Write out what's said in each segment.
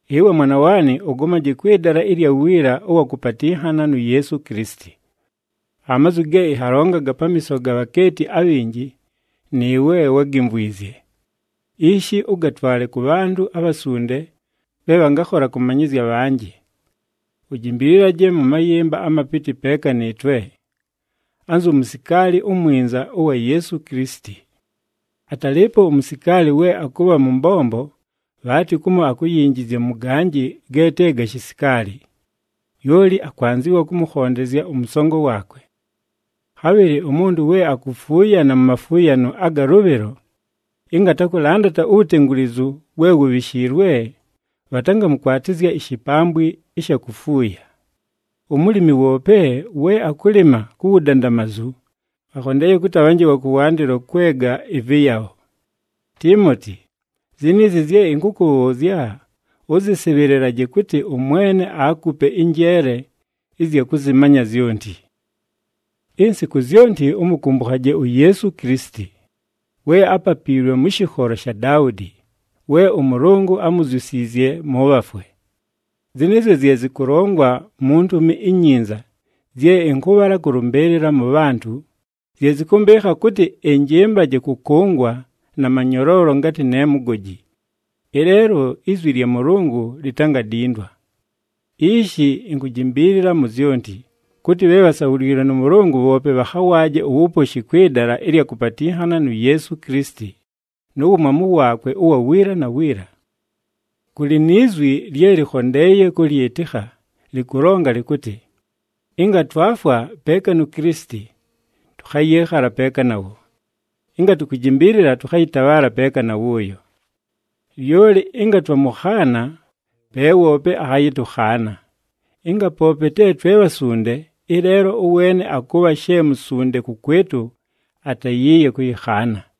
Ɨwe mwana waanɨ, ʉgomaje kwɨ dala ɨlya wiila ʉwa kʉpatɨnhana nu Yeesu Kilisiti. Amazwi ge ɨnhagalongaga pamiiso ga bhakeeti abhinji, nɨɨwe wágimvwizye. Ishi, ʉgatwale kʉ bhantʉ abhasunde bhe bhangakhola kʉmanyɨzya abhanjɨ. Ujimbililaje mʉ mayɨmba amapɨtɨ peeka nɨɨtwe, anzu musikaali umwinza ʉwa Yeesu Kilisiti. Atalɨɨpo umusikaali we akʉbha mʉ mbombo, bhaatɨ kumo akuyinjizya mʉ ganjɨ ge te ga shisikaali. Lyoli akwanzɨwa kʉmʉkhondezya ʉmʉsongo waakwe. Khabhɨlɨ umuntu we akufuuyana mu mafuuyano aga lʉbhɨlo, ɨnga atakʉlandata uwutengulizu we wubhishiilwe, bhatangamʉkwatɨzya ishipambwi ɨsha kufuuya. Umulimi woope we akʉlɨma ku wudandamazu, akhondeeye kʉtɨ abhanje wa kʉwandɨlo kwega ɨvɨyabho. Tiimoti, ziniizi zye ɨnkʉkʉbhʉʉzya, ʉzɨsɨbhɨlɨlaje kʉtɨ ʉMwene aakupe ɨnjeele ɨzya kʉzɨmanya zyonti. Insiku zyonti ʉmʉkʉmbʉkhaje uYeesu Kilisiti, we ápapiilwe mʉ shɨkholo sha Daudi, we ʉMʉlʉngʉ ámuzyusiizye mʉ bhafwe. Zɨnɨɨzyo zye zɨkʉlongwa mu Ntumi iNyinza zye ɨnkʉbhala kʉlʉmbɨɨlɨla mʉ bhantʉ, zye zɨkʉmbɨɨkha kʉtɨ ɨnjɨmbaje kʉkʉngwa na manyoloolo ngatɨ ne mugoji. Ɨleelo, izwi lya Mʉlʉngʉ litangadindwa! Ishi, inkujimbiilila mu zyonti, kʉtɨ, bhe bhasabhuliilwe nʉ Mʉlʉngʉ bhoope bhakhawaaje uwuposhi kwɨ dala ɨlya kʉpatɨnhana nu Yeesu Kilisiti, nu wumwamu waakwe ʉwa wiila na wiila. Kʉlɨ ni zwi lye lɨkhondeeye kʉlyɨtɨkha, lɨkʉlonga lɨkʉtɨ, “Ɨnga twafwa peeka nu Kilisiti, tʉkhayɨɨkhala peeka nawo. Ɨnga tukujimbiilila, tʉkhayɨtabhaala peeka na wʉʉyo. Lyoli ɨnga twamʉkhaana, pe woope akhayɨtʉkhaana. Ɨnga poope te twe bhasunde, ɨleelo ʉweene akʉbha she musunde kʉkwɨtʉ, atayiiye kʉyɨkhaana.”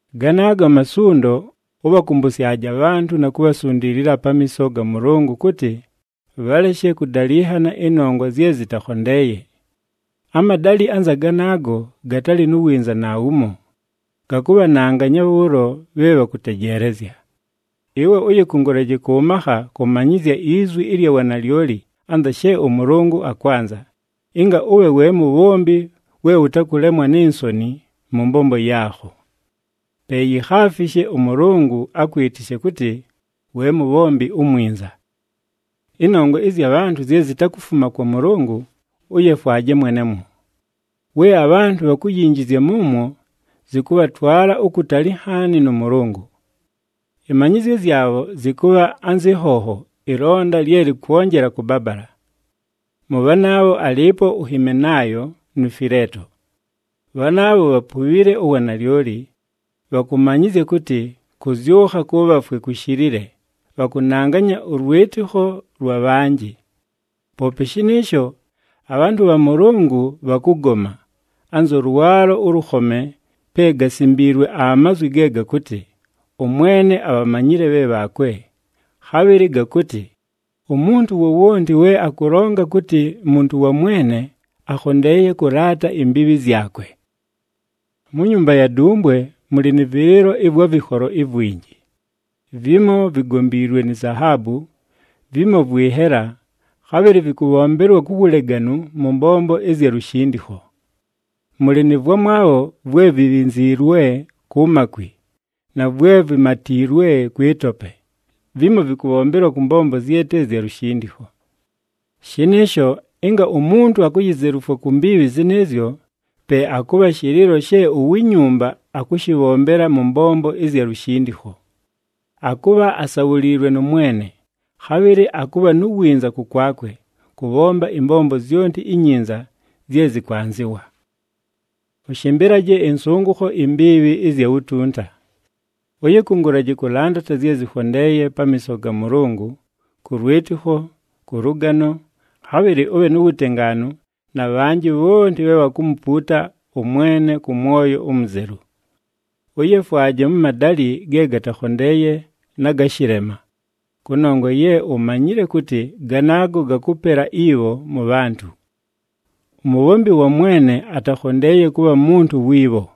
Ganaago amasundo, ʉbhakʉmbʉsyaje abhantʉ na kubhasundiilila pamiiso ga Mʉlʉngʉ kʉtɨ, bhaleshe kʉdalɨnhana ɨnongwa zye zɨtakhondeeye. Amadalɨ anza ganaago gatalɨ nu winza naawumo, gakʉbhananganya bhʉʉlo bhe bhakʉtejeelezya. Ɨwe ʉyɨkʉngʉlaje kʉ makha kʉmanyɨzya izwi ɨlya wanalyoli anza she ʉMʉlʉngʉ akwanza, ɨnga ʉbhe we mubhombi we ʉtakʉlemwa ni nsoni mʉ mbombo yaakho. Pe yikhaafishe ʉMʉlʉngʉ akwɨtɨshe kʉtɨ, we mubhombi umwinza. Ɨnongwa ɨzya bhantʉ zye zitakufuma kwa Mʉlʉngʉ, ʉyefwaje mwenemwo. We abhantʉ bhakuyinjizya mʉmwo, zɨkʉbhatwala ukutali nhaani nʉ Mʉlʉngʉ. Ɨmanyɨzyo zyabho zɨkʉbha anzɨ nhonho ɨlonda lye lɨkwonjela kʉbabala. Mʉ bhanaabho alɨɨpo uHimenaayo nu Fileeto. Bhanaabho bhapubhile uwanalyoli, bhakʉmanyɨzya kʉtɨ, kʉzyʉkha kʉ bhafwe kushilile, bhakʉnanganya ʉlwɨtɨkho lwa bhanjɨ. Poope shɨnɨɨsho, abhantʉ bha Mʉlʉngʉ bhakʉgoma, anzʉ lwalo ʉlʉkhome pe gasimbiilwe amazwi ge gakʉtɨ, “ɄMwene abhamanyile bhe bhaakwe,” khabhɨlɨ gakʉtɨ, “Umuntu wowonti we akʉlonga kʉtɨ muntu wa Mwene, akhondeeye kʉlaata imbiibhi zyakwe.” Mu nyumba ya dumbwe mʉlɨ nɨ vɨlɨɨlo ɨvwa vɨkholo ivwinji. Vimo vigombiilwe ni zahaabu, vimo vwɨ nhela, khabhɨlɨ vɨkʉbhombelwa ku wuleganu mʉ mbombo ɨzya lushindikho. Mʉlɨ nɨ vwamwabho vwe vibhinziilwe ku makwi, na vwe vimamatiilwe kwɨ tope, vimo vɨkʉbhombelwa kʉ mbombo zye te zya lushindikho. Shɨnɨɨsho, ɨnga umuntu akuyizelufwa ku mbiibhi zɨnɨɨzyo, pe akʉbha shɨlɨɨlo she uwi nyumba akʉshɨbhombela mʉ mbombo ɨzya lushindikho. Akʉbha asabhuliilwe nʉ Mwene, khabhɨlɨ akʉbha nu winza kʉkwakwe, kʉbhomba ɨmbombo zyonti inyinza zye zɨkwanzɨwa. Ʉshɨmbɨlaje ɨnsʉngʉkho imbiibhi ɨzya wutunta. Ʉyɨkʉngʉlaje kʉlandata zye zɨkhondeeye pamiiso ga Mʉlʉngʉ, kʉ lwɨtɨkho, kʉ lʉgano, khabhɨlɨ ʉbhe nu wutengaanu na bhanjɨ bhonti bhe bhakumupuuta ʉMwene kʉ mwoyo umuzelu. Ʉyefwaje mʉ madalɨ ge gatakhondeeye na ga shɨlema, kʉnongwa ye umanyile kʉtɨ ganaago gakʉpela ibho mʉ bhantʉ. Umubhombi wa Mwene atakhondeeye kʉbha muntu wi bho.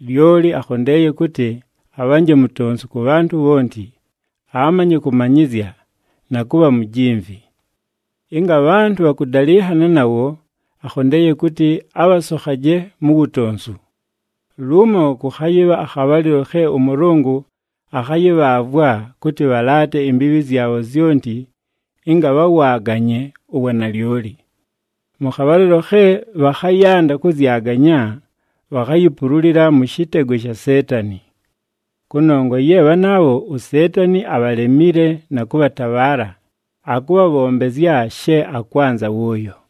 Lyoli akhondeeye kʉtɨ, abhanje mutonsu kʉ bhantʉ bhonti, amanye kʉmanyɨzya, na kʉbha mujimvi. Ɨnga abhantʉ bhakʉdalɨnhana nawo, akhondeeye kʉtɨ, abhasokhaje mu wutonsu. Lumo kʉkhayɨbha akhabhalɨlo khe ʉMʉlʉngʉ akhayɨbhaavwa kʉtɨ bhalaate imbiibhi zyabho zyonti ɨnga bhawaaganye uwanalyoli. Mʉ khabhalɨlo khe bhakhayanda kʉzyaganya, bhakhayipululila mʉ shɨtego sha Seetani. Kʉnongwa ye bhanaabho, uSeetani abhalemile na kʉbhatabhaala, akʉbhabhombezya she akwanza wʉʉyo.